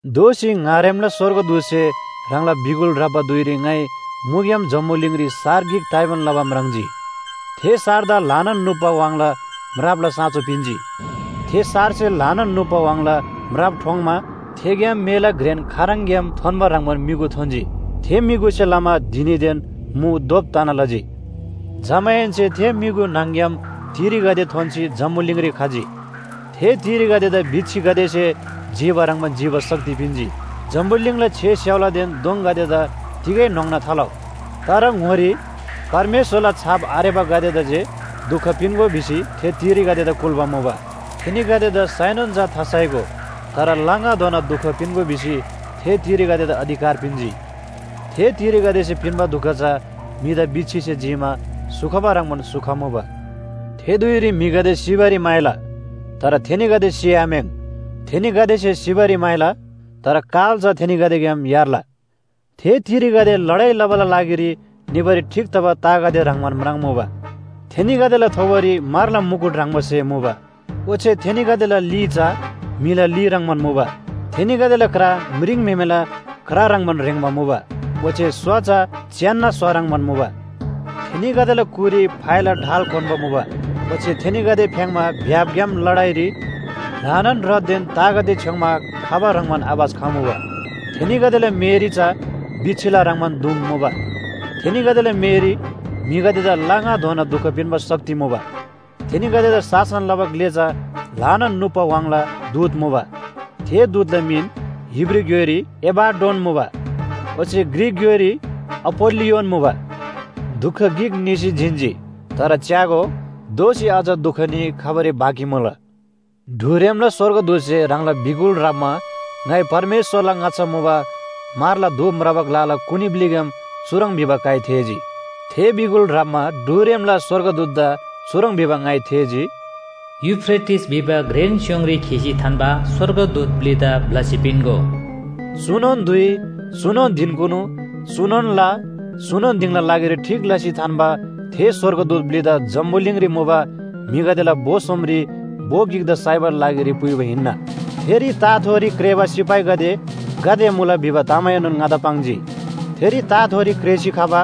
दोःसी ङारेमला स्‍वर्गदूतसे ह्राङला बिगुल ह्राप्‍बा धुइरी ङाइ मुग्‍याम जम्‍बुलिङरी सार गिक ताइबान लबा म्राङ्जी। थे सारदा ल्‍हानान नुप्‍बा व्‍हाङला म्रापला साँचो पिन्‍जी। थे सारसे ल्‍हानान नुप्‍बा व्‍हाङला म्राप ठोङ्‌मा थेग्‍याम मेला घ्रेन खाराङग्‍याम थोन्‍बा ह्रङ्‌बान म्‍युगु थोन्‍जी। थे म्‍युगुसे लमा धिनीदेन मु धोप तना लजी। जमाहेन्‍से थे म्‍युगु न्‍हङ‍ग्‍याम तिरीगदे थोन्‍सी जम्‍बुलिङरी खजी। थे तिरीगदेदा बिच्‍छीगदेसे जिबा ह्रङ्‌बान जिबा शक्ति पिन्‍जी। जम्‍बुलिङला छे स्‍याउलादेन दोङगदेदा तिगै न्‍होङ्ना थालउ। तर ङोरी परमेश्‍वरला छाप आरेबागदेदा जे दुख पिन्‍गो भिसी थे तिरीगदेदा कुल्‍बा मुबा। थेनीगदेदा साइनोन चा थासाइगो, तर ला ङाधोना दुख पिन्‍गो भिसी थे तिरीगदेदा अधिकार पिन्‍जी। थे तिरीगदेसे पिन्‍बा दुख चा म्‍हिदा बिच्‍छीसे जीमा स्‍हु खबा ह्रङ्‌बान स्‍हु खमुबा। थे धुइरी म्‍हिगदे सिबारी म्‍हाइला, तर थेनीगदे सिआम्‍याङ्। थेनीगदेसे सिबारी म्‍हाइला, तर काल चा थेनीगदेग्‍याम यार्ला। थे तिरीगदे लडाइ लबाला लागिरी निबारी ठीक तबा तागदे ह्रङ्‌बान म्राङ्‌मुबा। थेनीगदेला थोबोरी म्‍हरला मुकुट ह्रङ्‌बा स्‍हे मुबा। ओच्‍छे थेनीगदेला ली चा म्‍हिला ली ह्रङ्‌बान मुबा। थेनीगदेला क्रा म्रिङम्‍हेमेला क्रा ह्रङ्‌बान ह्रेङ्बा मुबा, ओच्‍छे स्‍वा चा च्‍यान्‍ना स्‍वा ह्रङ्‌बान मुबा। थेनीगदेला कुरी फाइला ढाल क्‍वान्‍बा मुबा। ओच्‍छे थेनीगदे फ्‍याङ्‌मा भ्‍यापग्‍याम लडाइरी ल्‍हानान रथदेन तागदे छ्‌योङ्‌मा खबा ह्रङ्‌बान आवाज खमुबा। थेनीगदेला मेःरी चा बिच्‍छीला ह्रङ्‌बान दुम मुबा। थेनीगदेला मेःरी म्‍हिगदेदा ला ङाधोना दुख पिन्‍बा शक्ति मुबा। थेनीगदेदा शासन लबा ग्‍ले चा ल्‍हानान नुप्‍बा व्‍हाङला दूत मुबा। थे दूतला मिन हिब्रू ग्‍योइरी एबाड्डोन मुबा ओच्‍छे ग्रीक ग्‍योइरी अपोल्‍लियोन मुबा। दुख गिक निसी जिन्‍जी। तर च्‍यागो, दोःसी अझ दुख न्‍ही खबारी बाँकी मुला। ढुरेमला स्‍वर्गदूतसे ह्राङला बिगुल ह्राप्‍मा ङाइ परमेश्‍वरला ङाच्‍छा मुबा म्‍हरला धूप म्राबा ग्‍लाला कुनी ब्‍लिग्‍याम चुह्रङ् भिबा काइ थेःजी। थे बिगुल ह्राप्‍बा ढुरेमला स्‍वर्गदूतदा चुह्रङ् भिबा ङाइ थेःजी, “यूफ्रेटिस भिबा घ्रेन स्‍योङरी खीसी थान्‍बा स्‍वर्गदूत ब्‍लिदा ब्‍लसी पिन्‍गो।” चुनोन धुइ, चुनोन धिनकुनु, चुनोन ला, चुनोन दिङला लागिरी ठीक लसी थान्‍बा थे स्‍वर्गदूत ब्‍लिदा जम्‍बुलिङरी मुबा म्‍हिगदेला भो सोमरी भो गिकदा साइबाला लागिरी पुइबा हिन्‍ना। थेरी ताथोरी क्रेःबा सिपाहीगदे गाते मुला भिबा तामएनोन ङादा पाङ्जी। थेरी ताथोरी क्रेःसी खबा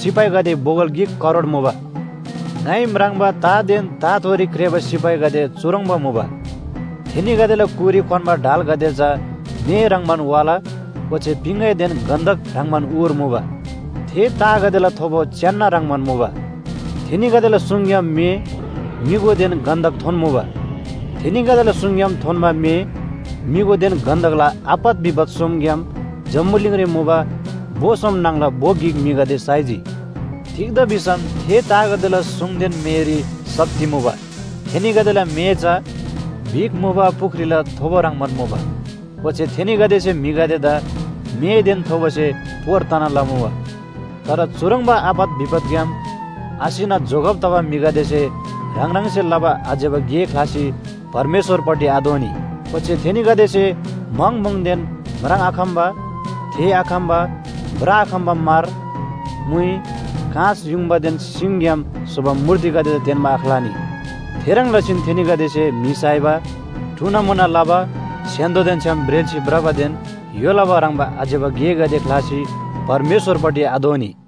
सिपाहीगदे बोगल गिक करोड मुबा। ङाइ म्राङ्बा तादेन ताथोरी क्रेःबा सिपाहीगदे चुह्रङ्बा मुबा, थेनीगदेला कुरी क्‍वान्‍बा ढालगदे चा मे ह्रङ्‌बान वाला ओच्‍छे पिङगैदेन गन्‍धक ह्रङ्‌बान उर मुबा। थे तागदेला थोबो च्‍यान्‍ना ह्रङ्‌बान मुबा। थेनीगदेला सुङग्‍याम मे, म्‍युगुदेन गन्‍धक थोन्‍मुबा। थेनीगदेला सुङग्‍याम थोन्‍बा मे, म्‍युगुदेन गन्‍धकला आपत विपत सोमग्‍याम जम्‍बुलिङरी मुबा भो सोम न्‍हङला भो गिक म्‍हिगदे साइजी। तिग्‍दा भिसम थे तागदेला सुङदेन मेःरी शक्ति मुबा। थेनीगदेला मेः चा बिख मुबा पुख्रीला थोबो ह्रङ्‌बान मुबा। ओच्‍छे थेनीगदेसे म्‍हिगदेदा मेःदेन थोबोसे पोर तना लमुबा। तर चुह्रङ्बा आपत विपतग्‍याम आसिना जोगब तबा म्‍हिगदेसे ह्राङ ह्राङसे लबा आज्‍यबा गे ख्‍लासी परमेश्‍वरपट्टि आदोःनी। ओच्‍छे थेनीगदेसे म्‍हङ म्‍हुङदेन म्राङ्आखम्‍बा, थेःआखम्‍बा, भ्रआखम्‍बा म्‍हर, म्‍हुइ, काँस, युङबादेन सिङग्‍याम स्‍होबा मूर्तिगदेदा तेन्‍बा आख्‍लानी। थेह्रङ् लसीन थेनीगदेसे म्‍हि साइबा, टुनामुना लबा, स्‍य्‍हान्‍दोदेन छ्‌याम ब्रेल्‍सी भ्रबादेन य्‍हो लबा ह्रङ्‌बा आज्‍यबा गेगदे ख्‍लासी परमेश्‍वरपट्टि आदोःनी।